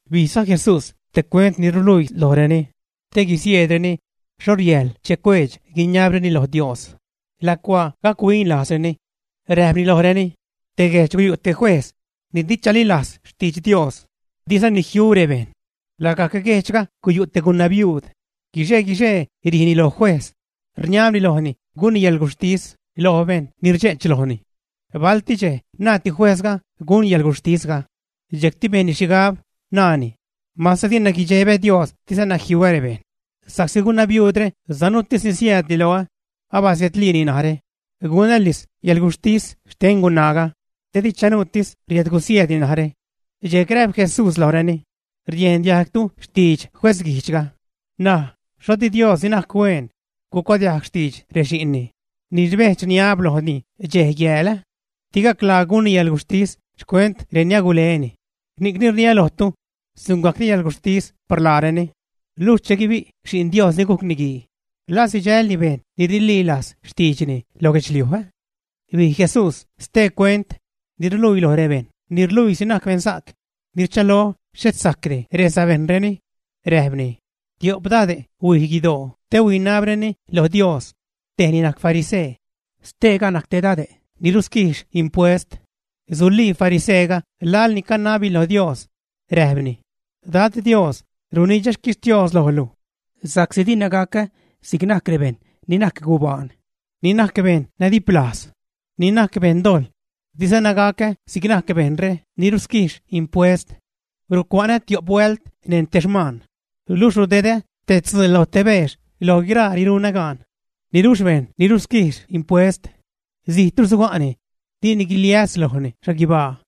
Bijza Jesús te cuent ni ruluii lojreni, te guisieedreni xho riajl cuedx-guiniabreni lo Dios lacuaa gac-huin lajzreni, räjpni lojreni: ―Te guejdx guyu' te juejz ni di chalilajz xtidx Dios, dizani jiu rebejṉ. Lagajc guejdxga guyu' te gunabiuud. Guixe-guixee rijni lo juejz, rniabni lojni gunni yäḻguxhtis lo bejṉ ni rdxe'ch lojni. Balti dxej naadti juejzga gun yäḻguxhtisga. Dxejcti bejnni xhigab, naani: “Mase dina guidxebä Dios, dizana jiuä rebejṉ, sa'csi gunabiuudre sanuutisni siäädni loä, abasiedliini narä, gunälis yäḻguxhtis xten gunaaga, te di chanuutis riädgusieedni narä.” Dxejc räjp Jesús lojreni: ―Riejn diajgtu xtidx juezguijdxga, N̲aj ¿xho di Dios, ni najc hueen, gucuadiajg xtidx rexi'nni ni rbedx-rniab lojni dxej-yääl? Di gaclaa gunni yäḻguxhtis xcuent reni aguleni. Ni'cni rniä lojtu, sungajcni yäḻguxhtis par laareni. Luxh che guibi' Xi'n Dios ni gujc Niguii, ¿la sidxälni bejṉ ni rililajz xtiidxni lo guedxliuj? Bij Jesús stee cuent ni ruluii loj rebejṉ ni rluiisi najc beṉsa'c, ni rchalo xhet sajcdi resabejṉreni. Räjpni: ―Tio'p dade' huij guidoo te huinabreni lo Dios. Tej ni najc farisee, steega najc te dade' ni rusquijx impuest. Sulii fariseega laḻ ni canabni lo Dios, räjpni: “Dad, Dios, runidxä xquixtios lojlu sa'csi dina gacä si'c najc rebejṉ ni najc gubaan, ni najc beṉ nadiplajz, ni najc beṉdojḻ, dizana gacä si'c najc bejṉre ni rusquijx impuest. Rucua'nä tio'p huält neṉ te xmaan, luxh rudedä te tzuu lo te beex loj guiraa ni runä gaan.” Niluxh bejṉ ni rusquijx impuest, zijtru suga'ni, dini guiliäs lojni xhaguibaa.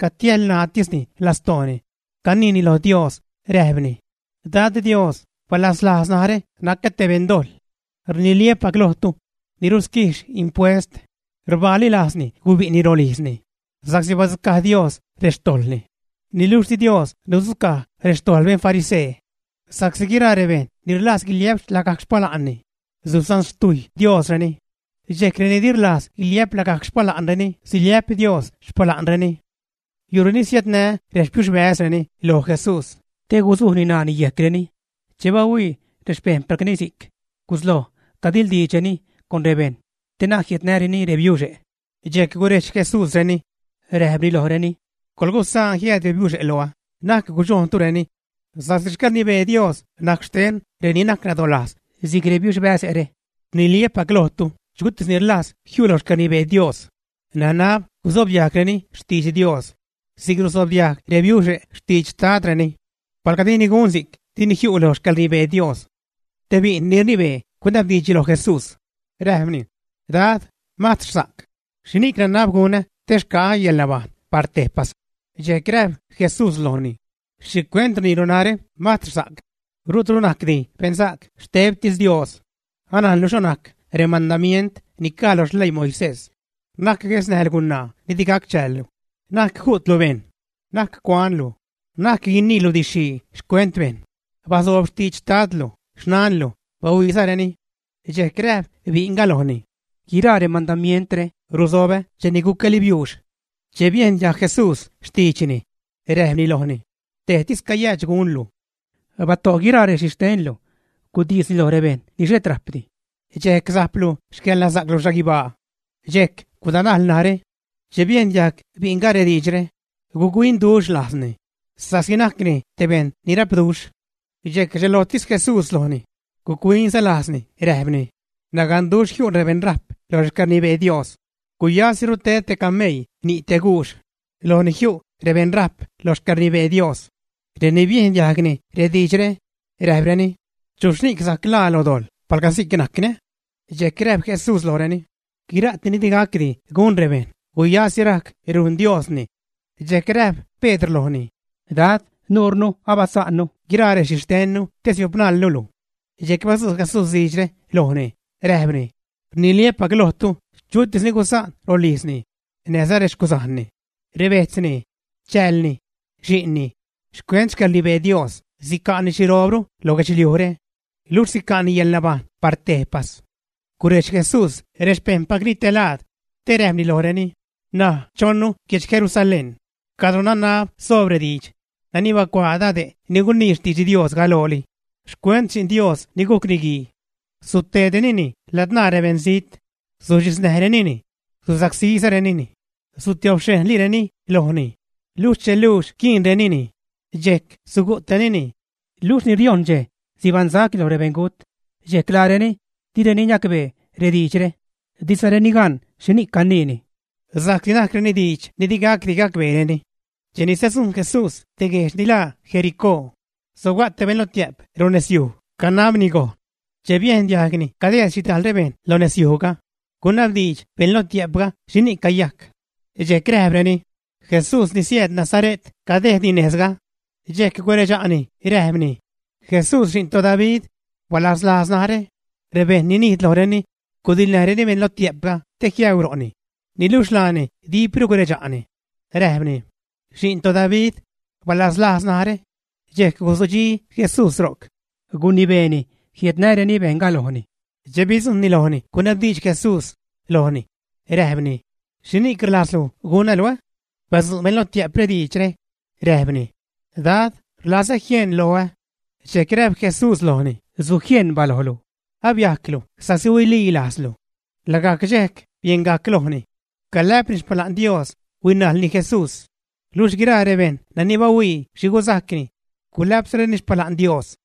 Catiälṉaatisni lastooni, caniini lo Dios, räjpni: “Dad, Dios, ¡balaslajz narä, nacä te beṉdojḻ!” Rniliä́pac lojtu, ni rusquijx impuest rbaali lajzni gubi'ni rolijzni sa'csi badzucaj Dios rextojḻni, niluxh di Dios nudzucaj rextojḻ beṉ farisee. Sa'csi guiraa rebejṉ ni rlajz guiliä'p lagajc xpala'nni, susanxtiujy Diosreni, dxejc reni di rlajz guiliä'p lagajc xpala'nreni, siliä'p Dios xpala'nreni. Yu'reni siädnä rexpiuxbäzreni loj Jesús te guzujni ṉaani yejcreni. Che bahuii rexpejṉpacni si'c, gusloj cadiḻdiidxreni con rebejṉ te na'c jiädnäreni rebiuxe'. Dxejc gurejdx Jesúsreni, räjpni lojreni: ―Coḻgusaan jiääd rebiuxe' loä, na'c gudxojntureni, sa'csi xcäḻrnibee Dios najc xten reni najc nadolajz si'c rebiuxbäze're. Rniliä́pac lojtu, chutis ni rlajz jiu' lo xcäḻrnibee Dios nanab gusobdiajgreni xtidx Dios si'c rusobdiajg rebiuxe' xtidx xtadreni. Palga dini gun si'c, dini jiu' lo xcäḻrnibee Dios. Te bi'n ni rnibee gunabdiidx loj Jesús, räjpni: ―Dad, mastrsa'c, ¿xhini'c nanab gunä te xca'ä yäḻnabajṉ par tejpas? Dxejc räjp Jesús lojni: ―¿Xhicuent rniilu narä: “Mastrsa'c”? Rutru najcdi beṉsa'c, xtebtis Dios. Anajnlu xho najc remandamient ni caj lo xleii Moisés: “Na'c guesnäjlu gunaa ni di gac chäällu; na'c ju'tlu bejṉ; na'c cuanlu, na'c guiniilu didx-xhii xcuent bejṉ; bazoob xtidx xtadlu, xnanlu, bahuiizareni.” Dxejc räjp bi'nga lojni: ―Guiraa remandamientre rusobä cheni gucäli biuux. Che biejn diajg Jesús xtiidxni, räjpni lojni: ―Tejtis cayäädx gunlu. Bato' guiraa rexhixtenlu, gudisni loj rebejṉ ni xhet rajpdi dxejc sajplu xcäḻnasa'clu xhaguibaa. Dxejc gudanajl narä. Che biejn diajg bi'nga rediidxre, guc-huinduxh lajzni, sa'csi najcni te bejṉ ni rapduxh. Dxejc rdxelojtis Jesús lojni, guc-huinza lajzni räjpni: ―Naganduxh jiu' rebeṉrajp lo xcäḻrnibee Dios. Guyasiru ted te cameii ni' te guux lo ni jiu' rebeṉrajp lo xcäḻrnibee Dios. Reni biejn diajgni rediidxre, räjpreni: ―¿Chuxhni'c sajc ḻaa lo dojḻ, palga si'c najcni? Dxejc räjp Jesús lojreni: ―Guira'ti ni di gacdi gun rebejṉ, guyasi rajc rujn Diosni. Dxejc räjp Pedr lojni: ―Dad, nuurnu abasa'nnu guiraa rexhixtennu te siopnalnu luj. Dxejc badzu' Jesús diidxre lojni, räjpni: ―Rniliä́pac lojtu, chutis ni gusaan rolijzni näjza rexcuzajnni, rebejtzni, chäälni, xi'nni xcuent xcäḻrnibee Dios, sica'ni xhiroobru lo guedxliujre, luxh sica'ni yäḻnabajṉ par tejpas. Gurejdx Jesús rexpejṉpacni te laad, te räjpni lojreni: ―N̲aj chonnu guedx Jerusalén cadro nanab soob rediidx nani bacuaa dade' ni gunii xtidx Dios galooli xcuent Xi'n Dios ni gujc Niguii. Sutedrenini ladzṉaa rebeṉzijt, suxhiznäjrenini, susacsírenini, sutiobxhejnlireni lojni, luxh che luux quiinrenini, dxejc sugu'trenini, luxh ni riojṉ dxej sibaṉsacni loj rebeṉgut. Dxejc laareni direni niacbee rediidxre, dizareni gan xhini'c caniini, sa'csi najcreni diidx ni di gacdi gacbeereni. Cheni sadzujṉ Jesús te guejdx ni laa Jericó, sobga' te beṉ lotiä'p ro' nezyuj, canabni gojn. Che biejn diajgni cadejd xhidajl bejṉ lo nezyujga, gunabdiidx beṉ lotiä'pga xhini'c cayajc. Dxejc räjpreni: ―Jesús ni siääd Nazare't cadejdni nezga. Dxejc guredxa'ni räjpni: ―¡Jesús, xi'n toDavid, balaslajz narä! Rebejṉ ni nijd lojreni gudiḻnäjreni beṉ lotiä'pga te jiäu ro'ni, niluxh laani dipru guredxa'ni, räjpni: ―¡Xi'n toDavid, balaslajz narä! Dxejc guzudxi Jesús ro'c, gunibeeni jiädnäreni bejṉga lojni. Che bidzujṉni lojni, gunabdiidx Jesús lojni, räjpni: ―¿Xhini'c rlajzlu gunnää́ luj? Badzu' beṉ lotiä'pga diidxre, räjpni: ―Dad, rlazä jieṉ loä. Dxejc räjp Jesús lojni: ―¡Sujieṉ balojlu! Abiajclu sa'csi huililajzlu. Lagajc dxej, bieṉgajc lojni, calä'pni xpala'n Dios, huinajlni Jesús. Luxh guiraa rebejṉ ni bahuii xhi guzajcni, gulä'pzareni xpala'n Dios.